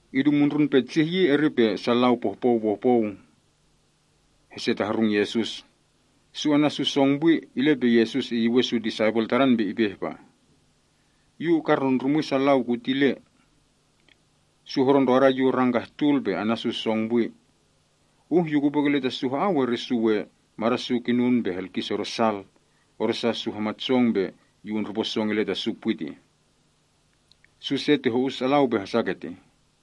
Idu petsih yi, eri pe lau pohpou pohpou hesetahrung Yesus. Su ana’ su song pwi, ile pe Yesus iyuwen su disaipel Tadan pe ipe ihpa, “Yu ukarndrundrumwi sa lau kutile. Su hodo ndroda yu rang kah tul, pe ana’ su song pwi. Uh Yu kupwe kile ta su ha‑au, eri su we mada’ su kinun pe helkis odo sal, odosa su hamat song pe Yu undrupo song ile ta su pwi tih. Su se ti ho‑us alau pe hasa ketih.”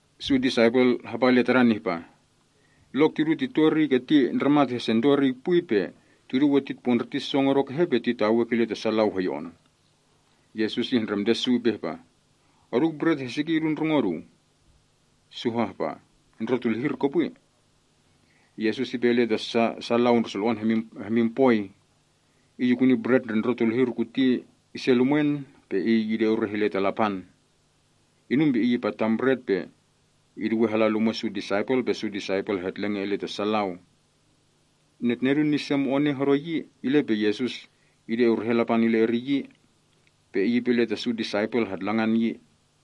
Su disaipel Tadan hapa ile Tadan ihpa, “Lok tidu tito eriy keti ndramat hesento eriy pwi, pe tidu we titpondriti song odo kehe pe titawei kile ta sa lau hoyo‑on?” Yesus ihndremte su ihpa, “Oduu bret heski idu ndrongo oduu?” Su hahpah, “Ndrotulihir kopwi.” Yesus ipe ile ta sa lau ndre sulo‑on hemin poi. Iy ikuni bret ndre ndrotulihir kuti ise lumwen, pe Iy ide ureh ile ta Lapan. Inum pe Iy ipatan bret pe iduwe hala lumwe’ su disaipel pe su disaipel hetlenge ile ta sa lau. Netnedun ni se mone hodo yi, ile pe Yesus ide urehen Lapan ile eriy yi. Pe Iy ipe ile ta su disaipel hatlangan yi.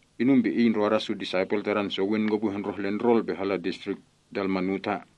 inum pe Iy ndroda su disaipel Tadan sowin kopwi hondroh ile ndrol pe hala Distrik Dalmanuta.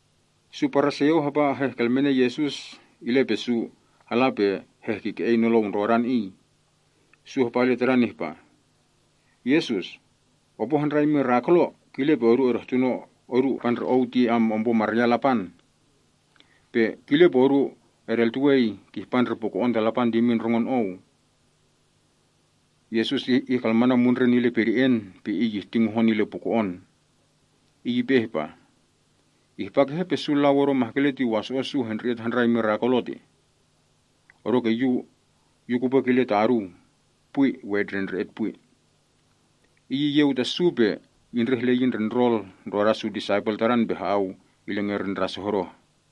Su Paraseo hapa hehkelmene Yesus ile pe su hala pe helehkike‑ei nolou ndrodan Iy. Su hapa ile Tadan ihpa, “Yesus, opo handrai mirakulo, kile pe odu edehtuno odu ihpa ndre Ou ti ompo maryan Lapan. Pe kile pe odu edeltuwei kihpa ndre puko‑on ta Lapan ti imin ndrongon Ou.” Yesus ihkalmanan mundren ile pede‑en pe Iy ihti ngohon ile puko‑on. Iy ipe ihpa, “Ihpa kehe pe su lau odo mahkele ti waso‑o’ su hendre‑et handrai mirakulo tih? Odoke Yu kupwe kile ta oduu. Pwi, we etndrendre‑et pwi.” Iy iyeu ta su, pe indreh ile yi ndre ndrol ndroda su disaipel Tadan pe ha‑au ile ngerin ndras hodoh.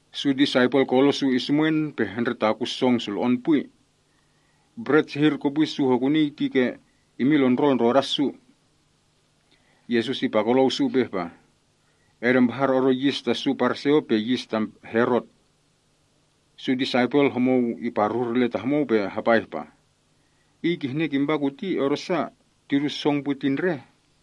Su disaipel kolo’ su isumwen pe hendretakun song sulo‑on pwi. Bret sehir kopwi su hokunii ti ke imin lon ndrol ndroda su. Yesus ipakolou su ihpa, “Edempahar odo yis ta su Paraseo, pe yis ta Herot.” Su disaipel, homou iparuhur ile ta homou pe hapa ihpah, “Iy kihne kimpa kuti odosa, tidu song pwi ti ndreh?”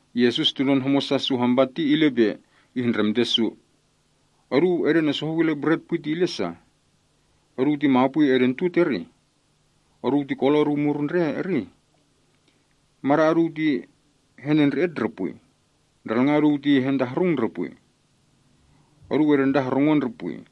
Yesus tunon homosa su hampa ti, ile pe ihndremte su, “Oduu edenesohou ile ‘bret pwi’ ti ile sa? Oduu ti mapwi edentut, eri? Oduu ti kolo’ oduu murun, eri? Mada’ oduu ti henendre‑et ndre pwi? Ndralnga’ oduu ti hertahrung ndre pwi? Oduu edentahorungon ndre pwi?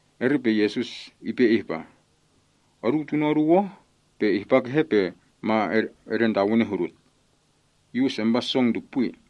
Eri pe Yesus ipe ihpa, “Oduu tuno’ oduu oh, pe ihpa kehe pe ma edentawene hudut? Yu usempa song ti pwi.”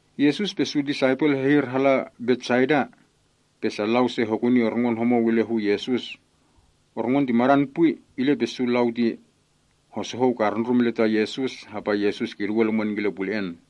Yesus pe su disaipel hehir hala Betsaida. Pe sa lau se hokuni orngon homou ile hu Yesus. Orngon ti madan pwi, ile pe su lau ti hosohou karundrum ile ta Yesus, hapa Yesus kiduwe lumwen kile pule‑en.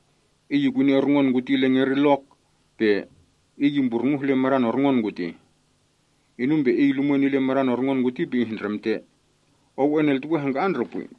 Iy ikuni orngon kuti ile ngerin lok, pe Iy imburnguh ile madan orngon kutih. Inum pe Iy lumwen ile madan orngon kuti pe ihndremte, “Ou eneltuwe hangka‑an ndre pwi?”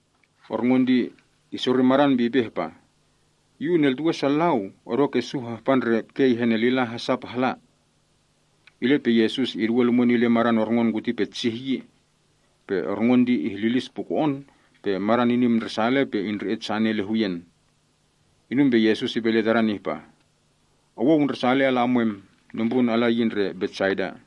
Orngon ti isori madan pe ipe ihpa, “Yu uneltuwe sa lau, odoke su hahpa ndre kei henelila hasa pe hala.” Ile pe Yesus iduwe lumwen ile madan orngon kuti petsih yi. Pe orngon ti ihlilis puko‑on pe madan inim ndresale pe indre‑et sane ile huyen. Inum pe Yesus ipe ile tadan ihpa, “Owou ndresale ala emwem. Nombrun ala yi ndre Betsaida.”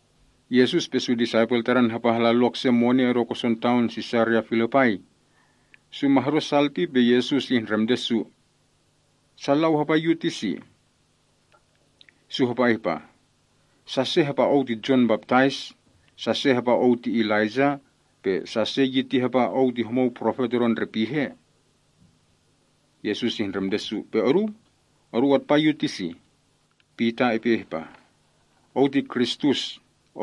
Yesus pe su disaipel Tadan hapa hala lok se mone odo koson taon Sisaria Filipai. Su ma hodo sal ti pe Yesus ihndremte su, “Sa lau hapa Yu ti si?” Su hapa ihpah, “Sa se hapa Ou ti Jon Baptais, sa se hapa Ou ti Elaijah, pe sa se yi ti hapa Ou ti homou profet odo ndre pihe.” Yesus ihndremte su, “Pe oduu? Oduu atpa Yu ti si?” Pita ihpah, “Ou ti Kristus.”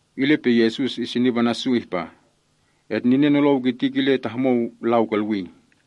Ile pe Yesus isinip ana’ su ihpa, “Etninen nolou kiti kile ta homou lau kolwii.”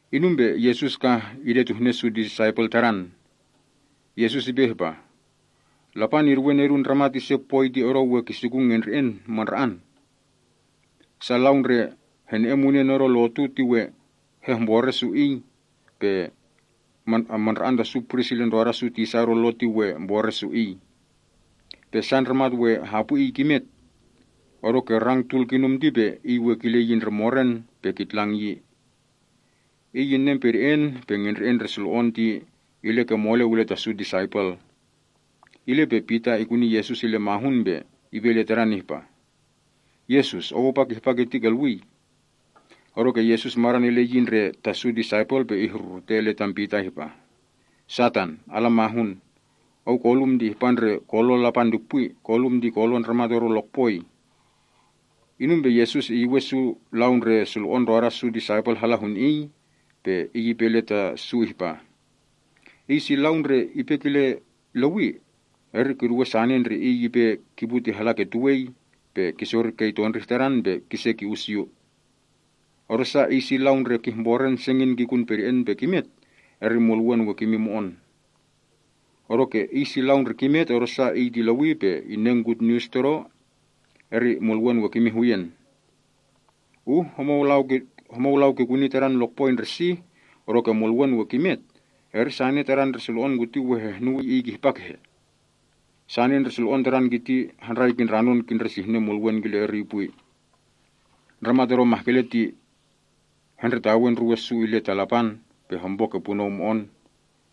Inum pe Yesus kah idetuhne su disaipel Tadan. Yesus ipe ihpah, “Lapan iduwe Nedun Ndramat ise poi ti odo we kisikun ngendre‑en mandra‑an. Su lau ndre hene‑en munen odo lotu ti we hehmbore su Iy, pe mandra‑an ta su pris ile ndroda su tisa odo lo ti we mbore’ su Iy. Pe sa ndramat we hapwi Iy kimet. Odoke rang tul kinum ti pe Iy we kile yi ndre moren pe kitlang yi.” Iy inen pede‑en pe ngendre‑en ndre sulo‑on ndre Iy we kikun ti ile ke moleu ile ta su disaipel. Ile pe Pita ikuni Yesus ile mahun pe ipe ile Tadan ihpah, “Yesus. Ou apa kihpa kiti kolwii.” Odoke Yesus madan ile yi ndre ta su disaipel pe ihrurute ile tam Pita ihpah, “Satan, ala ndruwe! Ou kolum ti indrahpa ndre kolon Lapan ti pwi. Kolum ti kolon ndramat odo lokpoi.” Inum pe Yesus iyuwen su lau ndre sulo‑on ndroda su disaipel hala hun Iy. Pe Iy ipe ile ta su ihpa, “Iy si lau ndre ipe kile lewi, eri kiduwe sane ndre iy ipe kipu ti hala ke tuwei, pe iy kisori kei tondrih tadan, pe kise ki‑us Yu. Odosa iy si lau ndre kihmboren sengin kikun pede‑en pe kimet, eri mulwen we kimin mo‑on. Odoke iy si lau ndre kimet, odosa iy ti lewi pe ininen gutnius Todo, eri mulwen we kimin huyen. Uh homou lau kikuni tadan lokpoi ndre sih, odoke mulwen we kimet, eri sane tadan ndre sulo‑on kuti we hehnuwii iy kihpa kehe? Sane ndre sulo‑on tadan kiti handrai kindranon kisihnen mulwen kile eriy pwi. Ndramat odo mahkele ti hendretawe ndruwe’ su ile ta Lapan, pe hompo ke punou mo‑on.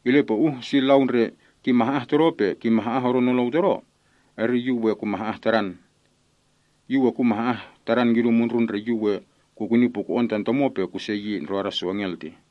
Ile pe uh si lau ndre kimah‑ah Todo, pe kimah‑ah odo nolou Todo, eri Yu we kumah‑ah tadan. Yu we kumah‑ah tadan kidu mundrun ndre Yu we kukuni puko‑on tan Tomo, pe kuse yi ndroda su engel tih.”